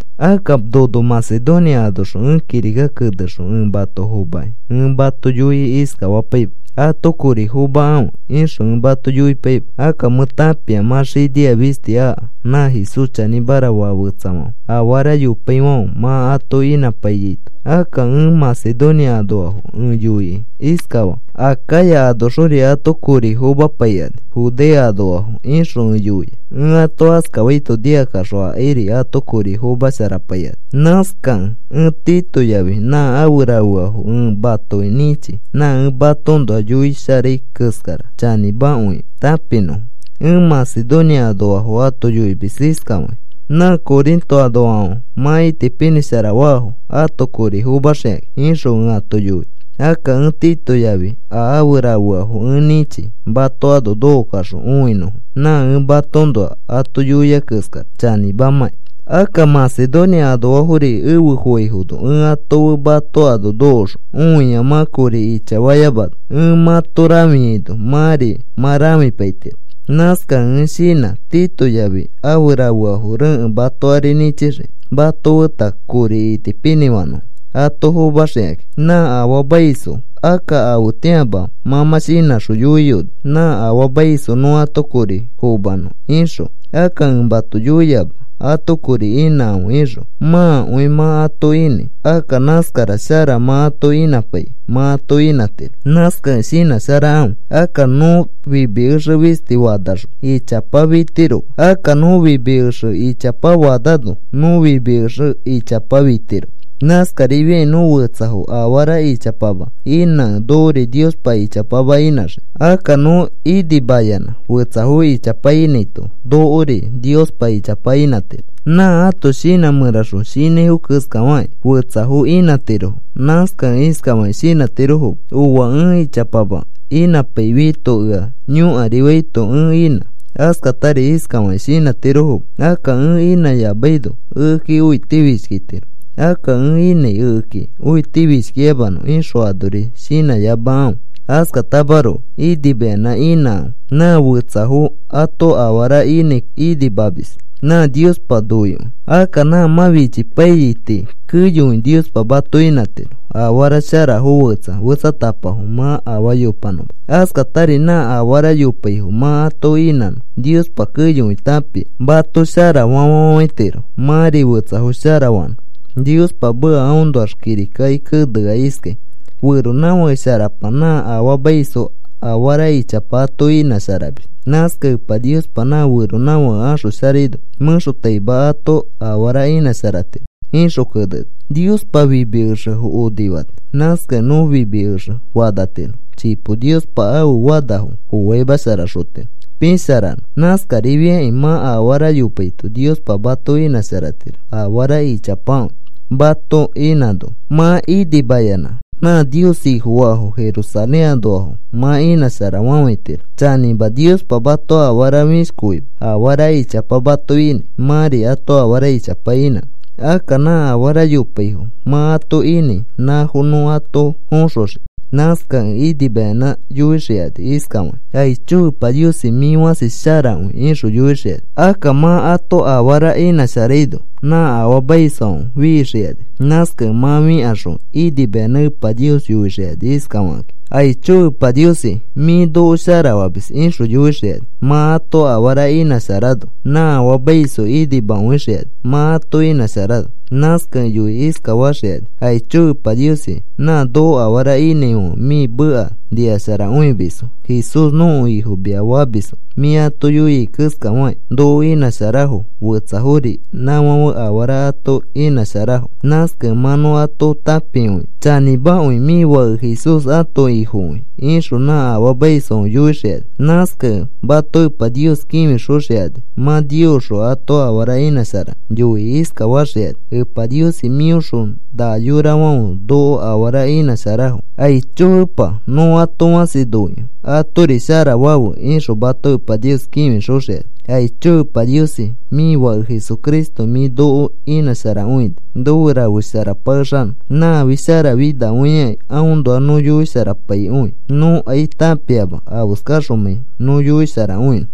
Akka nono Macedonia anoxõ ẽ kirika kenexõ ẽ mato fomakĩ ẽ mato yoikĩ iskafapaima: “Ato kori fomakãfe,” ixõ ẽ mato yoipaima. Akka mẽ tãpia mã xinia fisti aka nã Jesús chanĩmara faa fetsafãfe afara yopaifãfe mã ato inãpaiyaito. Akka ẽ Macedonia anoafo ẽ yoikĩ iskafaa: “Acaya anoxori ato kori fomapaikani Judea anoafo,” ixõ ẽ yoia. Ẽ ato askafaito nikakaxõ akairi ato kori fomasharapaikani. Nãskakẽ ẽ Tito yafi nã afe rafeafo ẽ matoki nĩchi nã ẽ matoõnoa yoisharai keskara chanĩmakõikẽ tãpinõfo. Ẽ Macedonia anoafo ato yoimis iskafakĩ: “Nã Corinto anoafãfe mã itipinĩshara faafo ato kori fomaxikakĩ,” ixõ ẽ ato yoia. Akka ẽ Tito yafi a afe rafeafo ẽ nĩchi mato ano nokokaxõ õinõfo nã ẽ matoõnoa ato yoia keskara chanĩmamãkĩ. Akka Macedonia anoafori efe foaifono ẽ ato fe mato ano nokoxõ õia mã kori ichafayamano ẽ mãto rãfiaino mãri mã rãfipaitiro. Nãskakẽ ẽ shinã Tito yafi afe rafeafo rekẽ mato ari nĩchixiki mato feta kori itipinĩfanõfo ato fomaxikakĩ nã afaamaisfo. Akka afetĩama mã mã shinãxõ yoiyoni: “Nã afaamaisfo nõ ato kori fomanõ,” ixõ. Akka ẽ mato yoiama: “Ato kori inãkãfe,” ixõ. Mãakõi mã ato inãi. Akka nãskara shara mã ato inãpaiki mã ato inãtiro. Nãskakẽ shinãsharakãfe. Akka nõ fimi exe fisti fanaxõ ichapa fitiroma. Akka nõ fimi exe ichapa fanano nõ fimi exe ichapa fitiro. Nãskarifiakĩ nõ fetsafo afara ichapama inãkẽ nokori Niospa ichapama inãxii. Akka nõ inimayanã fetsafo ichapa inãito nokori Niospa ichapa inãtiro. Nã ãto shinã mẽraxõ shinãifo keskafakĩ fetsafo inãtirofo. Nãskakẽ iskafakĩ shinãtirofoma: “Ooa, ẽ ichapama inãpaifiaito ea yõkarifaito ẽ inã.” Askatari iskafakĩ shinãtirofoma: “Akka ẽ inãyamaino ekeki õitifishkitiro. Akka ẽ inãi ekeki õitifishkiyamanõ,” ixõ anori shinãyamakãfe. Askatamaroko inimayanã inãkãfe. Nã fetsafo ato afara inãi inimamis nã Niospa noikõi. Akka nã mã fichipaiyai tii keyokõi Niospa mato inãtiro afara sharafo fetsa fetsatapafo mã afaa yopanõma. Askatari nã afara yopaifo mã ato inãno, Niospa keyokõi tãpia mato sharafa fafafãitiro mãri fetsafo shara fanõ. Niospa meka aõnoax kirikaki kenea iskai: Feronãfake sharapa nã afaamaisfo afara ichapa ato inãsharamis. Nãskakẽ Epa Niospa nã feronãfake axosharaino mẽxotaima ato afara inãsharatiro, ixõ keneni. Niospa fimi exefo onifani. Nãskakẽ nõ fimi exe fanatiro. Chipo Niospa ãfe fanafo foaimasharaxotiro pisharanõ. Nãskarifiakĩ mã afara yopaito Niospa mato inãsharatiro. Afara ichapakõi mato inãno mã inimayanã nã Nios Ifofaafo Jerusalén anoafo mã inãsharafafãitiro. Chanĩma, Niospa mato afaa fĩshkoima afara ichapa mato inãi mãri ato afara ichapa inãnõ. Akka nã afara yopaifo mã ato inãi nãfo nõ ato foxoxii. Nãskakẽ inimayanã yoixikani iskafakĩ: “Aicho Epa Niosi, mĩ fãsi sharakõi,” ixõ yoixikani. Akka mã ato afara inãsharaino nã afaamaisfãfe fixikani. Nãskakẽ mã fĩkaxõ inimayanã Epa Nios yoixikani iskafakakĩ: “Aicho Epa Niosi, mĩ noko shara famis,” ixõ yoixikani. Mã ato afara inãsharano nã afaamaisfo inimakõixikani mã ato inãsharano. Nãskakẽ yoikĩ iskafaxikani: “Aicho Epa Niosi, nã noko afara inãifãfe mĩ meka nikasharakõimisfo. Jesús nõko Ifo mia famisfo. Mĩ ato yoia keskafakĩ noko inãsharafo. Fetsafori nãfãfe afara ato inãsharafo. Nãskakẽ mã nõ ato tãpikõia chanĩmakõi mĩ Fake Jesús ãto Ifokõi,” ixõ nã afaamaisfãfe yoixikani. Nãskakẽ mato Epa Nios kĩfixoxikani. Mã Niosxõ ato afara inãsharakẽ, yoikĩ iskafaxikani: “Epa Niosi, mĩõxõ na yorafãfe noko afara inãsharafo. Aicho Epa, nõ ato fãsi noikõi. Atori shara fafe,” ixõ mato Epa Nios kĩfixoxikani. Aicho Epa Niosi, mĩ Fake Jesucristo mĩ noko inãsharakõini nofe rafesharapakexanõ. Nãfi sharafinakõiakĩ aõnoa nõ yoisharapaikõi nõkai tãpiama afeskaxomãi nõ yoisharakõinõ.